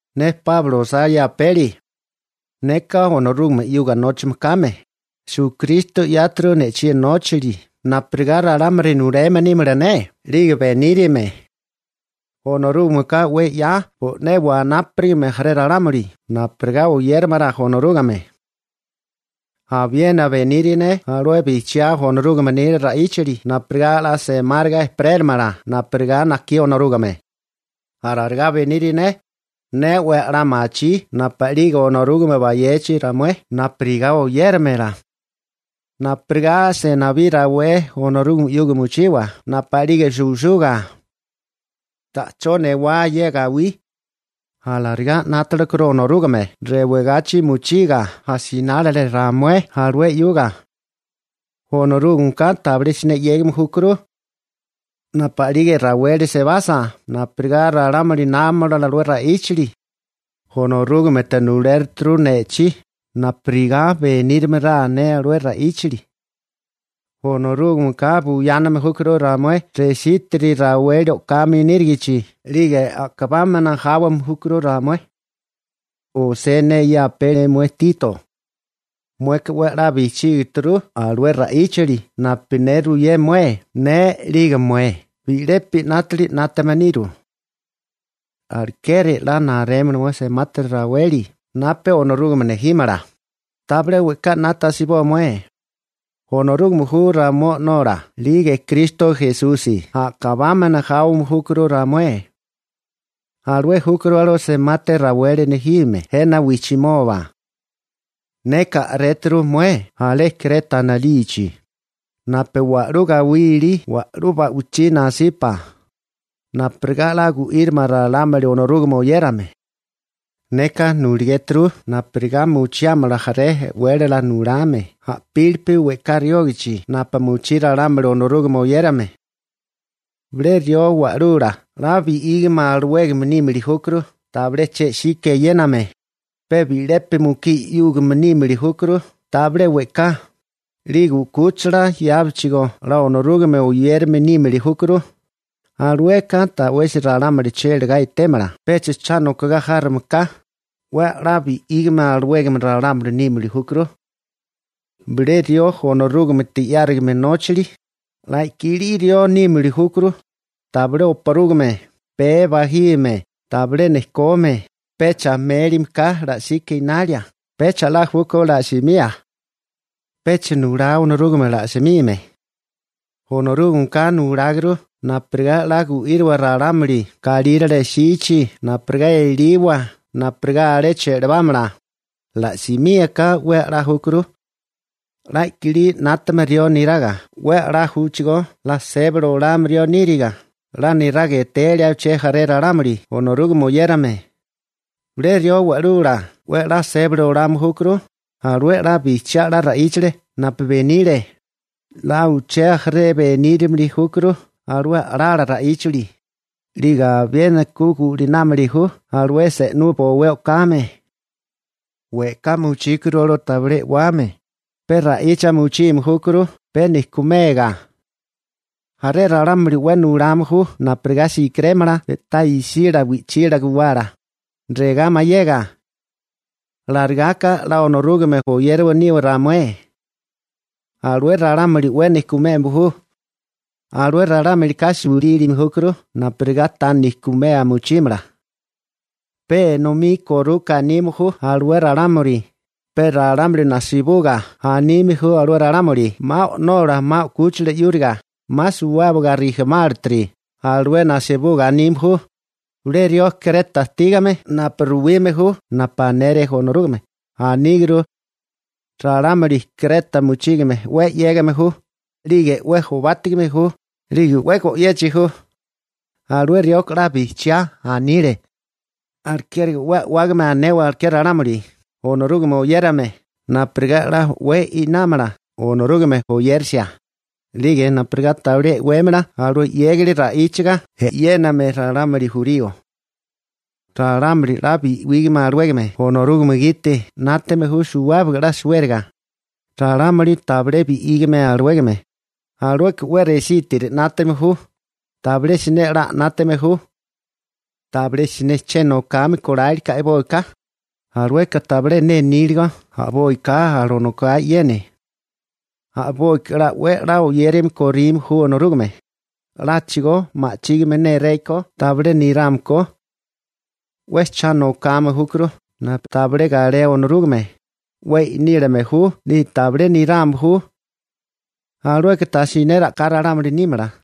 Ne Páulo osá ye apeli. Neka Onorúgame 'yuga nóchame kame. Esukristo 'yáturu ne'chí nóchali napurigá ralámuli nuleme nímala ne 'lige benírame. Onorúgameka 'we 'ya bo'né wanápuligame jaré ralámuli napurigá oyéramala Onorúgame. Abiena beniri ne alué bijchiá Onorúgame nila ra'íchali napurigá 'la semáriga ejperélamala napurigá najkí Onorúgame. Alarigá beniri ne, ne 'we 'la machí napu'lige Onorúgame bayechi ramué napurigá oyérimala, napurigá 'la senibí rawé Onorúgame 'yuga mochiwa napu'lige suwisuga. Ta'chó newá ye gawí, alarigá 'nátalekuru Onorúgame rewagachi mochiga asinálile ramué alué 'yuga. Onorúgameka tabilé siné 'yégame júkuru. Napu'lige raweli sebasa napurigá ralámuli námamala alué ra'íchali, Onorúgamete nulérituru ne'chí napurigá benírimala ne alué ra'íchali. Onorúgameka buyáname júkuru ramué resítiri raweli o'kame nírigichi 'lige a'kabámana jáwame júkuru ramué. Osé ne ye apeli mué Tito. Mueka 'we 'la bijchígituru alué ra'íchali napu ne ruyé mué. Ne 'lige mué bi'lepi 'nátili 'nátame niru. Alekeri 'la narémala mueka semati raweli napu Onorúgame nejímala, tabilé we'ká 'nata asiboa mué. Onorúgame ju ramué O'nola 'lige Kristo Esusi a'kabámana jáwame júkuru ramué. Alué júkuru alué semati raweli nejime jena wijchimoba. Neka a'réturu mué alé Kreta anilichi, napu wa'lú gawí ilí wa'lú ba'wichí nasipa, napurigá 'la gu'írimala ralámuli Onorúgame oyérame. Neka nuligéturu napurigá mochiámala jaré e'wélala nulame a'pílipi we'ká riógichi napu mochí ralámuli Onorúgame oyérame. Bilé rió wa'lula 'la bi'ígame alawégame nímili júkuru tabilé che'sika eyéname, pe bi'lepi mukí 'yúgame nímili júkuru tabilé we'ká, 'lige 'kúchila yábechigó 'la Onorúgame oyérame nímili júkuru, alueka ta'wesi ralámuli chélagá etémala pecha cha nokogá járome ka, 'we 'la bi'ígame alawégame ralámuli nímili júkuru. Bilé rió Onorúgamete 'yárigame nóchali, 'la kilí rió nímili júkuru, tabilé oparúgame, pee bajime, tabilé nejkome, pecha mélime ka la'sika enalia, pecha 'la júkó la'simía. Pecha nulá Onorúgame la'simime. Onorúgameka nuláguru napurigá 'la gu'íriwa ralámuli galírale jsichi napurigá eliwa napurigá alé che'lebámala, ala'simía ka 'we 'la júkuru. 'La kilí 'nátame rió niraga 'we 'la júchigó 'la sébali olame rió níriga, 'la niraga etelia uché jaré ralámuli Onorúgame oyérame. Bilé rió wa'lula 'we 'la sébali olame júkuru alué 'la bijchiá 'la ra'íchali napu benile, 'la uché jaré benírimili júkuru alué a'lala ra'íchali, 'lige abiena ku gu'linámili ju alué se'nú bowé o'kame. We'ká mochíguru alué tabilé e'wame, pe ra'icha mochime júkuru pe nejkumega. Jaré ralámuli 'we nulame ju napurigá si'kirémala pe'tá isila wi'chila guwala, regá mayega: «Alarigá ka 'la Onorúgame oyérame niwa ramué.» Alué ralámuli 'we nejkumeme ju. Alué ralámulika sulílime júkuru napurigá ta nejkumea mochímala. Pe enomí koruka anime ju alué ralámuli, pe ralámuli najsibuga anime ju alué ralámuli 'ma o'nola 'ma 'kúchila 'yúriga, 'ma suwábaga rijimálatiri, alué najsibuga anime ju. Bilé rió Kreta ajtígame napu ruwime ju napu anele Onorúgame, aníguru: «Ralámuli Kreta mochígame 'we 'yégame ju, 'lige 'we jobátigame ju, 'lige 'we go'yechi ju.» Alué rioka 'la bijchiá anile. Alekeri 'we a'wágame anewa aleké ralámuli Onorúgame oyérame napurigá 'la o'wé inámala Onorúgame oyerisia, 'lige napurigá tabilé e'wémala alué 'yégali ra'íchaga e'yéname ralámuli jurío. Ralámuli 'la bi'ígame alawégame Onorúgame gite 'nátame ju suwábaga 'la suériga. Ralámuli tabilé bi'ígame alawégame, alueka 'we resítiri 'nátame ju. Tabilé siné 'la 'nátame ju. Tabilé siné che nokame kólálike a'boika. Alueka tabilé ne níligo a'boika alanokae e'yene. A'boika 'we 'la oyérame korime ju Onorúgame, 'láchigo ma'chígime néréko tabilé nirame ko. 'We cha nokame júkuru napu tabilé galé Onorúgame, 'we i'nílame ju 'lige tabilé nirame ju. Alueka tajsiné a'ká ralámuli nímala.